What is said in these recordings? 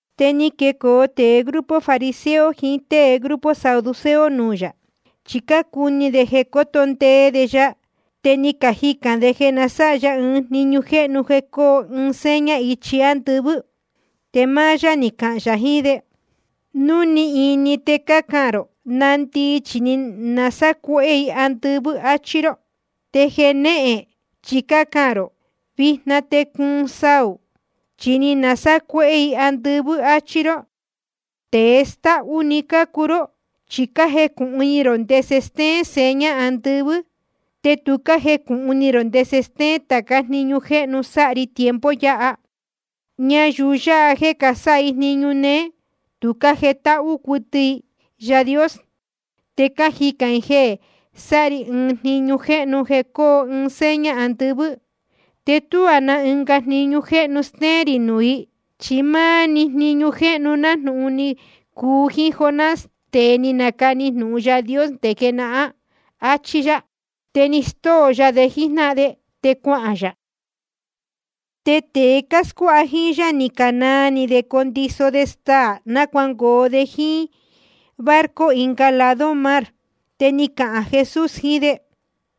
Te ni quecoo tēe grupo fariseo jiín tée grupo saduceo nuū yā. Chi cácuni de coto ndee de ya, te ni cajicān de jeē na sáha ya ɨɨn jniñu jéhnu jeē coo ɨɨn seña ichi ándɨvɨ́. Te máá yá ni cahān yā jiín de: Núu ni ini, te cácahān rō: Nandii, chi ni nasácuéhé i andɨvɨ́, áchí ró. Te jenéhen chi cácahān rō: Vijna te cuun saū, chi ni nasácuéhé i andɨvɨ́, áchí ró. Tēe stáhú‑ni cácuu ró. Chi cájecūhun ni rō ndese stéén seña andɨvɨ́, te tu cájecūhun ni rō ndese stéén tācá jniñu jéhnu sáha ri tiempo yáha. Ñayuu yáha jeē casáha jniñu néé, tu cájetáhú cuɨtɨ i Yaā Dios. Te cájicān i jeē sáha ri ɨɨn jniñu jéhnu jeē coo ɨɨn seña andɨvɨ́. Te tuá na ɨnga jniñu jéhnu stéén rī nuū i, chi máá‑ni jniñu jéhnu nájnūhun ni cuu jíín Jonás, tēe ni nacani jnūhun Yaā Dios nde jenahán. Achí yá. Te ni stóo ya de jíjnáhan de, te cuahān yā. Te tēe cáscuáha jíín yá ni canaa ni de condiso de staā náa cuangoo de jíín barco ɨnga lado mar. Te ni cahān Jesús jiín de: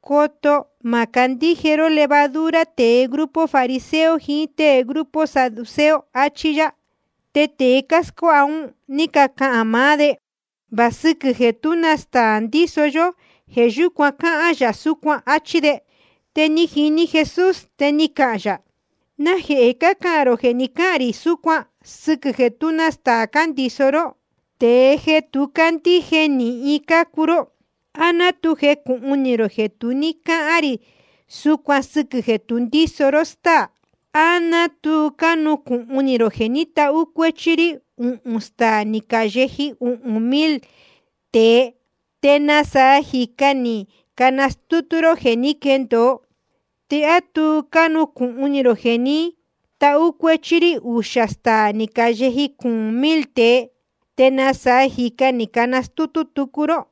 Coto má candíje ró levadura tēe grupo fariseo jiín tée grupo saduceo, achí yá. Te tēe cáscuáha un ní cacahān maá de: Va sɨquɨ̄ jeē tú na staā ndíso yó, jeē yúcuan cáhán yā súcuan, áchí de. Te ni jini Jesús, te ni cahān yā: ¿Najehē cácahān rō jeē ni cáhān rī súcuan sɨquɨ̄ jeē tú na staā cándiso ró? Tēe tu cándíje nīhin cácuu ró. ¿A ná tu jecūhun ni rō jeē tu ní cáhán rī súcuan sɨquɨ̄ jeē tu ndíso ró stáā? ¿A tu cánucūhun ni rō jeē ní tahú cuéchí rí uhūn staā ni cayeji uhūn mil tēe, te nasaa jīca ni canastútú ró jeē ni quéndōo? ¿Te á tu cánucūhun ni rō jeē ní tahú cuéchí rí uxā staā ni cayeji cuūn mil tēe, te nasaa jīca ni canastútú tucu ró?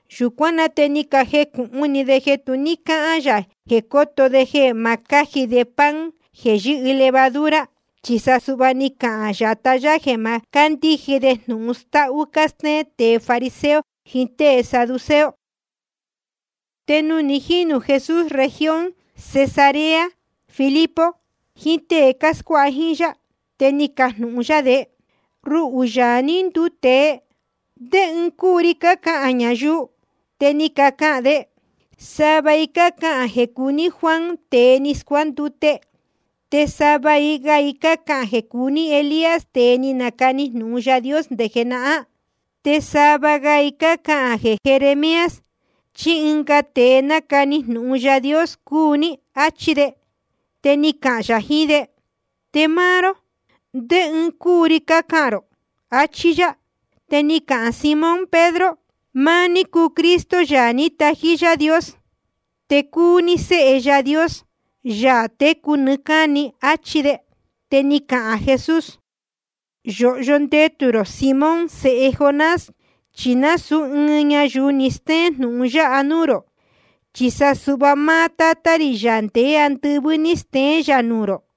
Yūcuán na te ni cajecūhun ni de jeē tu ní cáhán yā jeē coto de jeē ma cáji de pan jeē yɨ́hɨ levadura, chi sa suhva ni cahān yatá yá jeē ma cándíje de jnūhun stáhú cástéén tēe fariseo jiín tée saduceo. Te nuū ni jínū Jesús región Cesarea Filipo jiín tée cáscuáha jíín yá, te ni cajnūhun yá de: Ruhū, Yaā ní nduu tēe, ¿ndé ɨɨn cúu ri cácahān ñayuu? Te ni cacahān de: Sava i cácahān jeē cúu ní Juan tēe ni scuándute. Te sava ga i cácahān jeē cúu ní Elías, tēe ni nacani jnūhun Yaā Dios nde jenahán. Te sava ga i cácahān jeē Jeremías chí ɨnga tēe ni nacani jnūhun Yaā Dios cúu ní. Achí de. Te ni cahān yā jiín de: Te máá ró, ¿ndé ɨɨn cúu ri cácahān rō? achí yá. Te ni cahān Simón Pedro: Máá ní cúu Cristo, Yaā ní tají Yaā Dios. Te cúu ní Sēhe Yaā Dios, Yaā técu nɨɨ́ cáni, áchí de. Te ni cahān Jesús: Yōhyo ndetū rō, Simón sēhe Jonás, chi nasūú ɨɨn ñayuu ni steén jnūhun yáha nuū rō, chi sa suhva máá Tátá rī, Yaā ndeé andɨvɨ́, ní steén yā nuū rō.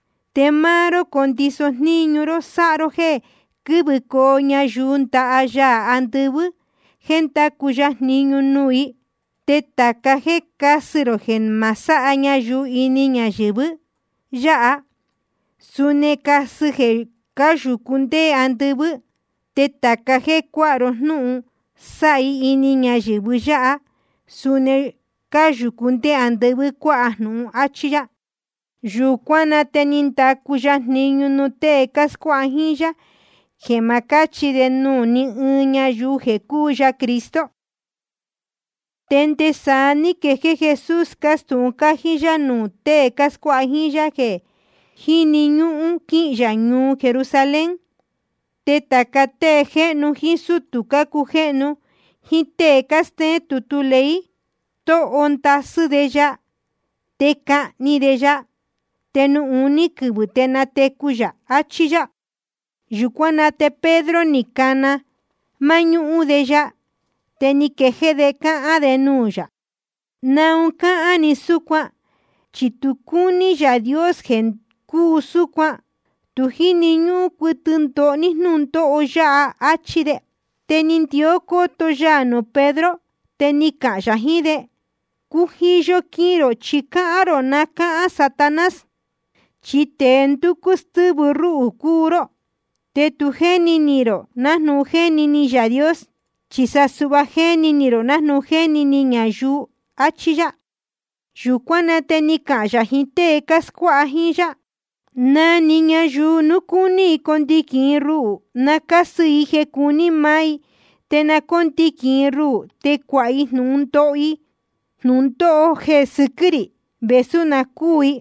Te máá ró condiso jníñu ró sáha ró jéē quɨ́vɨcoo ñayuu ndaha Yaā andɨvɨ́ jeē ndacu ya jniñu nuū i. Te tāca jéē cásɨ rō jeē ma sáha ñayuu ini ñayɨ̄vɨ yáha, suni casɨ jeē cáyūcú nde andɨvɨ́. Te tāca jéē cuáha ró jnúhun sáha i ini ñayɨ̄vɨ yáha, suni jeē cáyūcú nde andɨvɨ́ cuáha jnūhun. Achí yá. Yūcuán na te ni ndacu ya jniñu nuū tée cáscuáha jíín yá, jeē ma cáchi de nuū ní ɨɨn ñayuu jeē cúu ya Cristo. Te nde saá ní quejéé Jesús cástūhun cájí yá nuū tée cáscuáha jíín yá jeē jíni ñúhún quihīn yā ñuu Jerusalén. Te tāca tée jéhnu jíín sútū cácujéhnu jíín tée cástéén tutu ley, stóho ndasɨ́ de ya. Te cahni de ya, te nuū uní quɨvɨ̄ te natecu yā, achí yá. Yūcuán na te Pedro, ni cana máñúhún de ya, te ni quejéé de cáhán de nuū yā: ¿Naun cáhán ni súcuan? Chi tu cúní Yaā Dios jeē cuu súcuan. Tu jíni ñúhún cuɨtɨ ndoho ní jnúndóho yáha, áchí de. Te ni ndió cóto ya nuū Pedro, te ni cahān yā jiín de: Cujiyo quihīn rō, chi cáhán rō ná cáhán Satanás. Chi tēe ndúcú stɨ́vɨ rúhū cúu ró. Te tu jéni ni rō nájnūhun jéni ni Yaā Dios, chi sa suhva jéni ni rō nájnūhun cájeni ni ñayuu. Achí yá. Yūcuán na te ni cahān yā jiín tée cáscuáha jíín yá: Na‑ni ñayuu núu cúní i condiquīn i ruhū, na cásɨ i jeē cuní maá i, te na cóndiquīn i ruhū te cuāha i jnūhun ndoho i jnūndóho jeē sɨquɨ́ rī, vēsú na cúū i.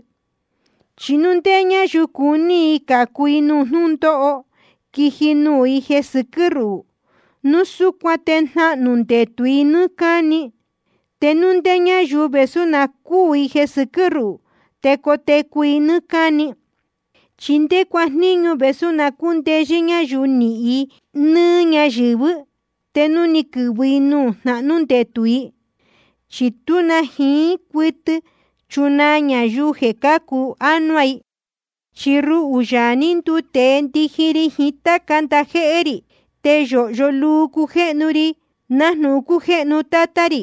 Chi núu ndé ñáyuu cuní i cācu i nuū jnúndóho quiji nuū i jeē sɨquɨ́ ruhū, núu súcuan te jnahnū ndetū i nɨ́ɨ́ cáni. Te núu ndé ñáyuu, vēsú na cúū i jeē sɨquɨ́ ruhū, te cotecu i nɨ́ɨ́ cáni. ¿Chi ndé cuajníñu vēsú na cúndeyɨ́ ñáyuu nihīn i nɨ́ɨ́ ñáyɨ̄vɨ́, te núu quɨ̄vɨ i nuū jnahnú ndetū i? Chi tú na jiín cuɨtɨ chunaa ñayuu jeē cácu ánuá i. Chi ruhū, Yaā ní nduu tēe, ndiji ri jiín táca ndajéhé rī, te yōhyo luu cujéhnu ri nájnūhun cújéhnu Tátá rī.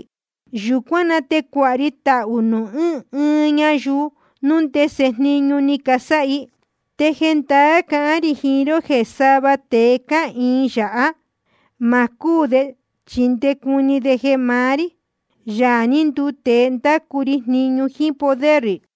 Yūcuán na te cuāha ri tahū nuū ɨɨn ɨɨn ñayuu núu ndese jniñu ni casáha i. Te jendaá cahán rī jiín ró jeē sava tēe cáhīin yāhá, ma cúū de chi nde cuni de jeē maá rí, Yaā ní nduu tēe, ndácu ri jniñu jíín poder rī.